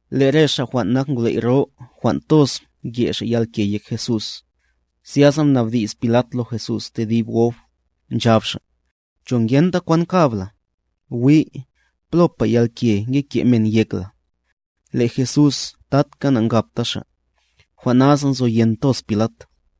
Le' re ngwley' jwan' nyebe' jwan' toz mke' xa' yalke yek Jesús. Zyasa mnabdi's Pilat lo Jesús tedib gob, nchab xa': —¿Cho ngenta kwan kab la? ¡Wi', plopa yalke nge ke' men yek la! Le' Jesús tatka na'nkabta Xa'; jwan' nasa nzoyen toz Pilat.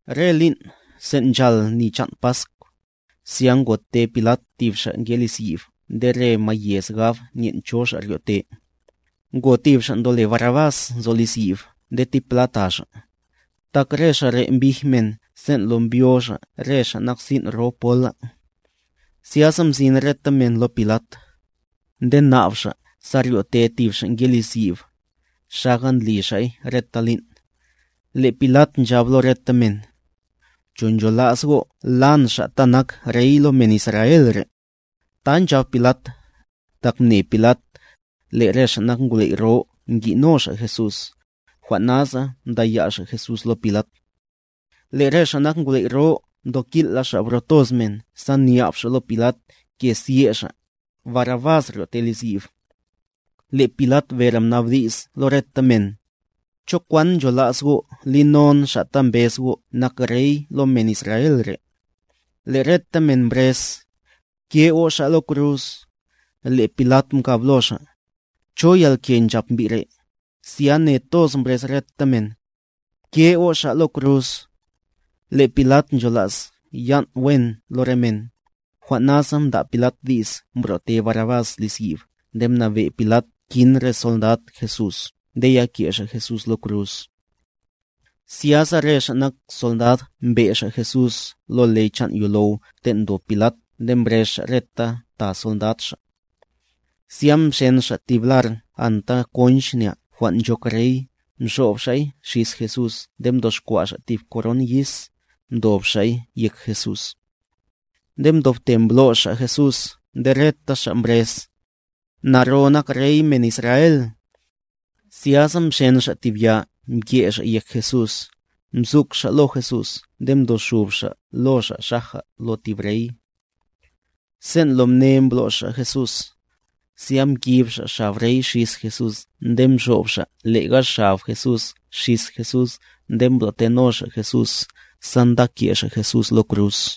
Re lin', sen' nchal ni chan' Pask, zya ngote Pilat tib xa' nke liz yib nde re mayez gab nyen' cho xa' ryo'te. Ngo tib xa' ndole Barrabás nzo liz yib nde tipla ta xa', tak re xa' re' mbij men sen' lo mbyo xa' re xa' nak sin' ro pola. Zyasa mzin reta men lo Pilat, nde nab xa' sa ryo'te tib xa' nke liz yib, xaga ndli xa'y reta lin'. Le' Pilat nchab lo reta men: —¿Cho nchola's go' la'n Xa' ta nak Rey lo men Israel re'? Ta nchab Pilat, tak mne Pilat, le' re ngwley' jwan' nyebe' ngi'no xa' Jesús, jwan' nasa mdaya' xa' Jesús lo Pilat. Le' re ngwley' jwan' nyebe' mtokil'la xa' bro toz men sa nyab xa' lo Pilat ke sye' xa', Barrabás ryo'te liz yib. Le' Pilat bere mnabdi's lo reta men: —¿Cho kwan nchola's go' li non Xa' ta mbez go' nak Rey lo men Israel re'? Le' reta men mbrez: —¡Bke' go' Xa' lo kruz! Le' Pilat mkab lo xa': —¿Cho yalke nchap mbi' re'? Zya ne toz mbrez reta men: —¡Bke' go' Xa' lo kruz! Le' Pilat nchola's yan' wen lo re men, jwan' nasa mda' Pilat di's mbro'te Barrabás liz yib nde mnabe' Pilat kin re sondad Jesús nde yake' xa' Jesús lo kruz. Zyasa re xa' nak sondad mbe' xa' Jesús lo le chan' yolow ten' ndob Pilat nde mbrez xa' reta ta sondad xa'. Zya mxen xa' tib lar konch,a mxob xa'y xis Jesús nde mdoxkwa' xa' tib koron yis, mdob xa'y yek Jesús. Nde mdobte mblo's xa' Jesús nde reta xa' mbrez: —¡Naro nak Rey men Israel! Zyasa mxen xa' tib ya mke' xa' yek Jesús, mzuk xa' lo Jesús nde mdoxub xa' lo Xa' xaja lo tib rey. Sen' lo mne mblo's xa' Jesús, zya mkib xa' xab rey xis Jesús nde mxob xa' lega xab Jesús xis Jesús nde mbro'teno xa' Jesús sa nda ke' xa' Jesús lo kruz.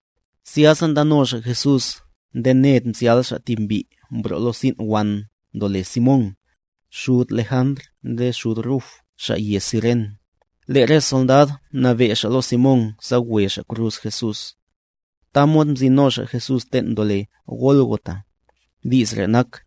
Zyasa ndano xa' Jesús nde ned mzyal' xa' tib mbi' mbro' lo sin' wan ndole Simón, xud Lejantr nde xud Ruf xa' yez Ciren, le' re sondad mnabe' xa' lo Simón sa we xa' kruz Jesús. Tamod mzin no xa' Jesús ten' ndole Gólgota. (Di's re' nak: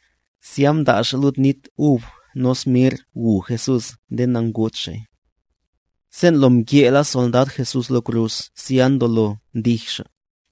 Zya mda' xa' lud nit ub nos mirrc gu Jesús nde nangud Xa'y. Sen' lo mke'la sondad Jesús lo kruz zya ndolo mdij xa',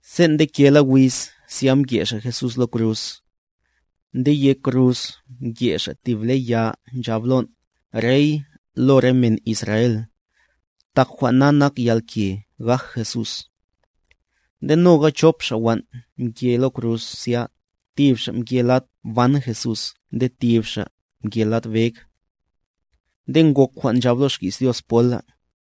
Sen' ndekela wiz zya mke' xa' Jesús lo kruz. Nde yek kruz mke' xa' tib ble ya nchab lon': “REY LO RE MEN ISRAEL.” Tak jwan' na nak yalke gaj Jesús. Nde noga chop xa' wan' mke lo kruz zya, tib xa' mke lad ban Jesús nde tib xa' mke lad beg. Nde ngok jwan' nchab lo xki's Dios pola: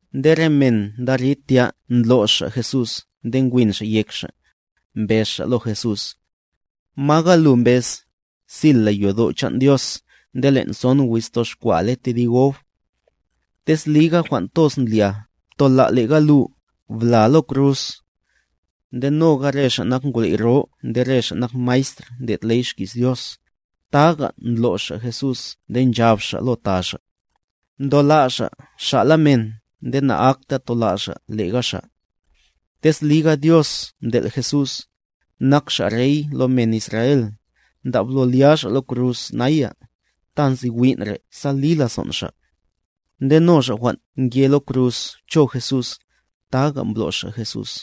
Nde re men ndarid tya ndlo's xa' Jesús nde nkwin xa' yek xa', mbez xa' lo Jesús: —Maga lu mbez, sil la yodo' chan' Dios nde len' son wiz toxkwa'a le tedib gob. Tez liga jwan' toz ndlia, ptola' lega lu, bla lo kruz. Nde noga re ngwley' jwan' nyebe' nde re xa' nak maestr ndlo' ley xki's Dios, taga ndlo's xa' Jesús nde nchab xa' lo ta xa': —Mtola' Xa' xa'la men nde na'akta tola' Xa' lega Xa'. Tez liga Dios mtel' Jesús, nak Xa' Rey lo men Israel, ndablo lya Xa' lo kruz naya, ta nzi win' re' sa li lazon' Xa'. Nde no xa' jwan' nke lo kruz cho Jesús, taga mblo's xa' Jesús.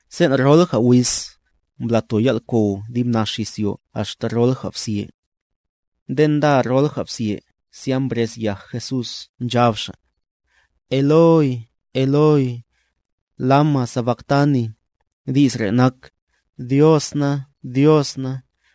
Sen' rolja wiz, mblato yal'kow dib nax izyo axta rolja bzye. Nde nda rolja bzye zya mbrez yaj Jesús nchab Xa': —Eloi, Eloi, ¿lama sabaktani? (Di's re' nak: Dios na, Dios na,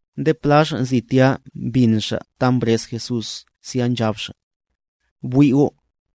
Nde pla xa' nzi tya mbin xa' ta mbrez Jesús zya nchab xa': —Bwi' go',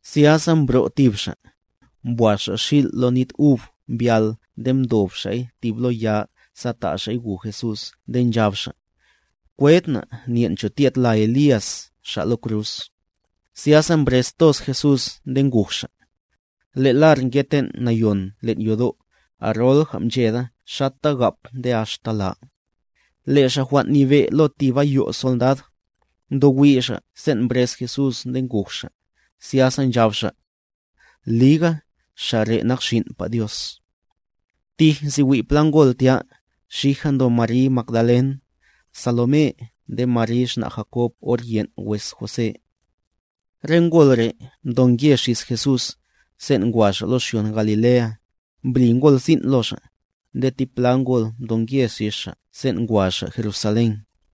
Zyasa mbro' tib xa', mbwaz xil' lo nit ub mbyál nde mtob xa'y tib lo ya sa ta' xa'y gu Jesús nde nchab xa': —Kwed na' nyen' cho tyed la Elías Xa' lo kruz. Zyasa mbrez toz Jesús nde nguj Xa'. Le' lar nge ten' Nayon len' yodo', arolja mcheda xata gap nde axta la. Le' xa' jwan' nyebe' lo tib ayo' sondad, ndowi' xa' sen' mbrez Jesús nde nguj Xa', zyasa nchab xa': —Liga, Xa' re' nak Xin'pa Dios. Tij nzi wi' pla ngol tya; xija ndo Mary Magdalen,h Salomé nde Mary xna' Jakob or yen' wes José. Re ngol re' mdonke xis Jesús, sen' ngwa Xa' lo xyon Galilea, mbli ngol sin' lo Xa'; nde tipla ngol mdonke xis Xa' sen' ngwa Xa' Jerusalén.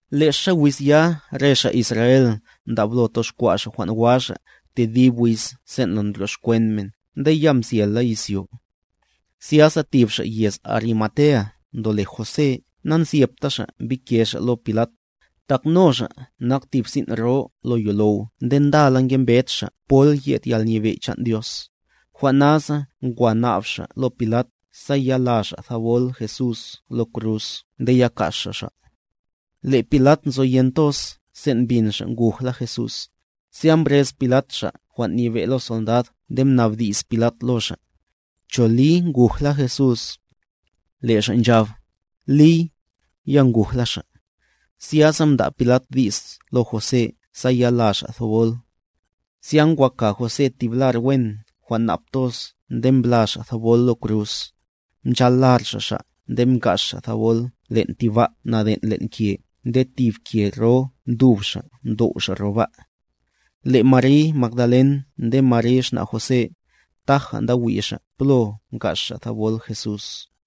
Lexa wiz ya re xa' Israel ndablo toxkwa' xa' jwan' wa xa' tedib wiz sen' ndryoxkwen men nde ya mzyela izyo. Zyasa tib xa' yez Arimatea ndole José nanzyepta xa' mbike xa' lo Pilat, tak no xa' nak tib sin' ro lo yolow nde ndala ngembed xa' pol yed Yalnyebe' chan' Dios, jwan' nasa ngwa nab xa' lo Pilat sa ya la xa' thabol Jesús lo kruz nde ya ka's xa' Xa'. Le' Pilat nzoyen toz sen' mbin xa' ngujla Jesús; zya mbrez Pilat xa' jwan' nyebe' lo sondad nde mnabdi's Pilat lo xa': —¿Cho li nguj la Jesús? Le' xa' nchab: —Liy, ya ngujla Xa'. Zyasa mda' Pilat di's lo José sa ya la xa' thabol. Zya ngwa ka José tib lar wen jwan' nap toz nde mbla xa' thabol lo kruz, mchal lar xa' Xa' nde mka's xa' thabol len' tib ba' naden' len' ke nde tib ke ro mtub xa' mtow' xa' ro ba'. Le' Mary Magdalen nde Mary xna' José, taja nda wi' xa' plo mka's xa' thabol Jesús.